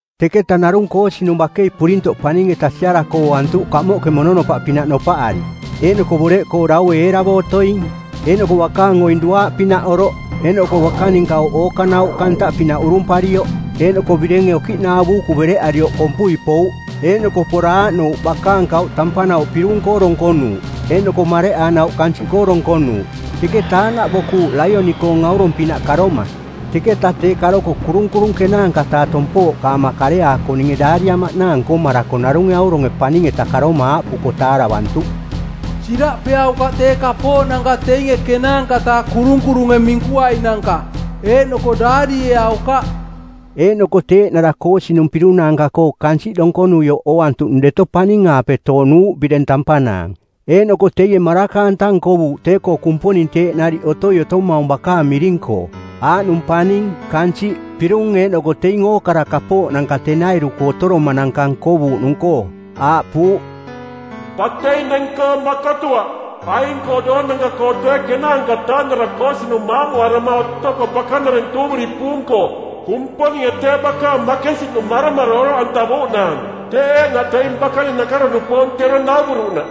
Teketa narung koosinung bakei purintoꞌ paning-eta siarako ooantuꞌ kamoꞌke mononopaꞌpinaꞌ nopaꞌari, eeꞌnoko boreꞌkoo daue eeravo otoing, eeꞌnoko bakaang oing duaaꞌpinaꞌ oroꞌ, eeꞌnoko bakaning kauꞌ ookanauꞌka ntaꞌpinaꞌ urumparioꞌ. Eeꞌnoko birenge okiꞌnaa buuku bereꞌarioꞌ kompui pouꞌ. Eeꞌnoko pora aaꞌnouꞌ bakaang kauꞌ tampanauꞌ pirung-koo donkonuuꞌ eeꞌnoko mareꞌanauꞌ kansiꞌkoo donkonuuꞌ. Teketa aaꞌnaꞌ bokuvuꞌ laioni-koong aurong-pinaꞌ karoma, teketa tee karoko kurunkurung ˜kenaanka-taa tompooꞌkaama kareaako ninge daariamaꞌnaang nkomarako narunge auronge paning-eta karoma aaꞌpuko taaravantuꞌ, “Siraꞌpeaukaꞌ tee kapooꞌnanka teinge ˜kenaanka-taa kurunkurunge minkuainanka, eeꞌnoko daarieaukaꞌ!” Eeꞌnoko tee eeꞌnara koosinung pirung naanka-koo kansiꞌ donkonuioꞌ ooantuꞌnung deto paning-aape toonuuꞌ bireng tampanaang. Eeꞌnoko teie maraka-anta nkovuuꞌ tee-koo Kumponing teeꞌ nariꞌ otoi otomaung bakaang miring-koo, aaꞌnung paning, kansiꞌ, pirung eeꞌnoko teing ookara kapooꞌnanka tenairu-koo otoromananka nkovuuꞌnung-koo; aaꞌpuuꞌ, “Batei neng-koo makotuaꞌ. Aing-koo doonanka-koo tee ˜kenaanka-taa-nara koosinung maamuarama otoko bakanareng tuuviri puung-koo, Kumponinge tee bakaang makensiꞌnung maromaro oroꞌantavuuꞌnaang, teeꞌ eeꞌnaꞌ teing bakaning nakaro-nupoong˜ tero nauvuruꞌnaꞌ.”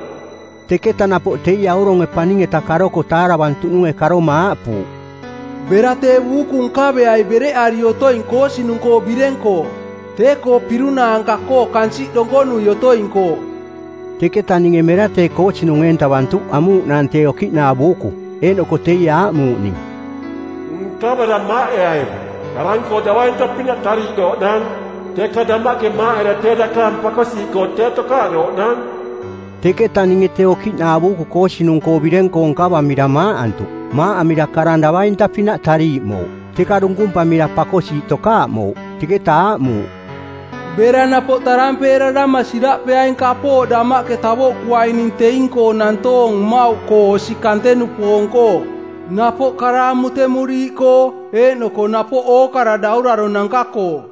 Teketa napoꞌ teie auronge paning-eta karoko taaravantuꞌnunge karoma aaꞌpuuꞌ, “Bera tee buuku nkaveai bereꞌari otoing koosinung-koo bireng-koo, tee-koo pirung naanka-koo kansiꞌ donkonui otoing-koo.” Teketa ninge mera tee koosinung eentavantuꞌ amuuꞌnaang tee okiꞌnaa buuku. Eeꞌnoko teie aaꞌmuuꞌ ning, “Nkavera maaꞌeai. Karang-koo davainta-pinaꞌ tariiꞌdooꞌnaang, teka damaꞌke maaꞌera tee dakaang pakosiiꞌkoo tee tokaaꞌdooꞌnaang.” Teketa ninge tee okiꞌnaa buuku koosinung-koo bireng-koo nkavamira maaꞌantuꞌ. Maaꞌamira karang davainta-pinaꞌ tariiꞌmouꞌ, teka dunkumpamira pakosiiꞌ tokaaꞌmouꞌ. Teketa aaꞌmuuꞌ, “Bera napoꞌ tarampeerarama˜ siraꞌpeaing kapooꞌ damaꞌke tavoꞌkuaining teing-koo nantoong mmauꞌkoo osi kante-nupoong-koo, napoꞌ kara amutemuriiꞌkoo eeꞌnoko napoꞌ ookara dauraronanka-koo.”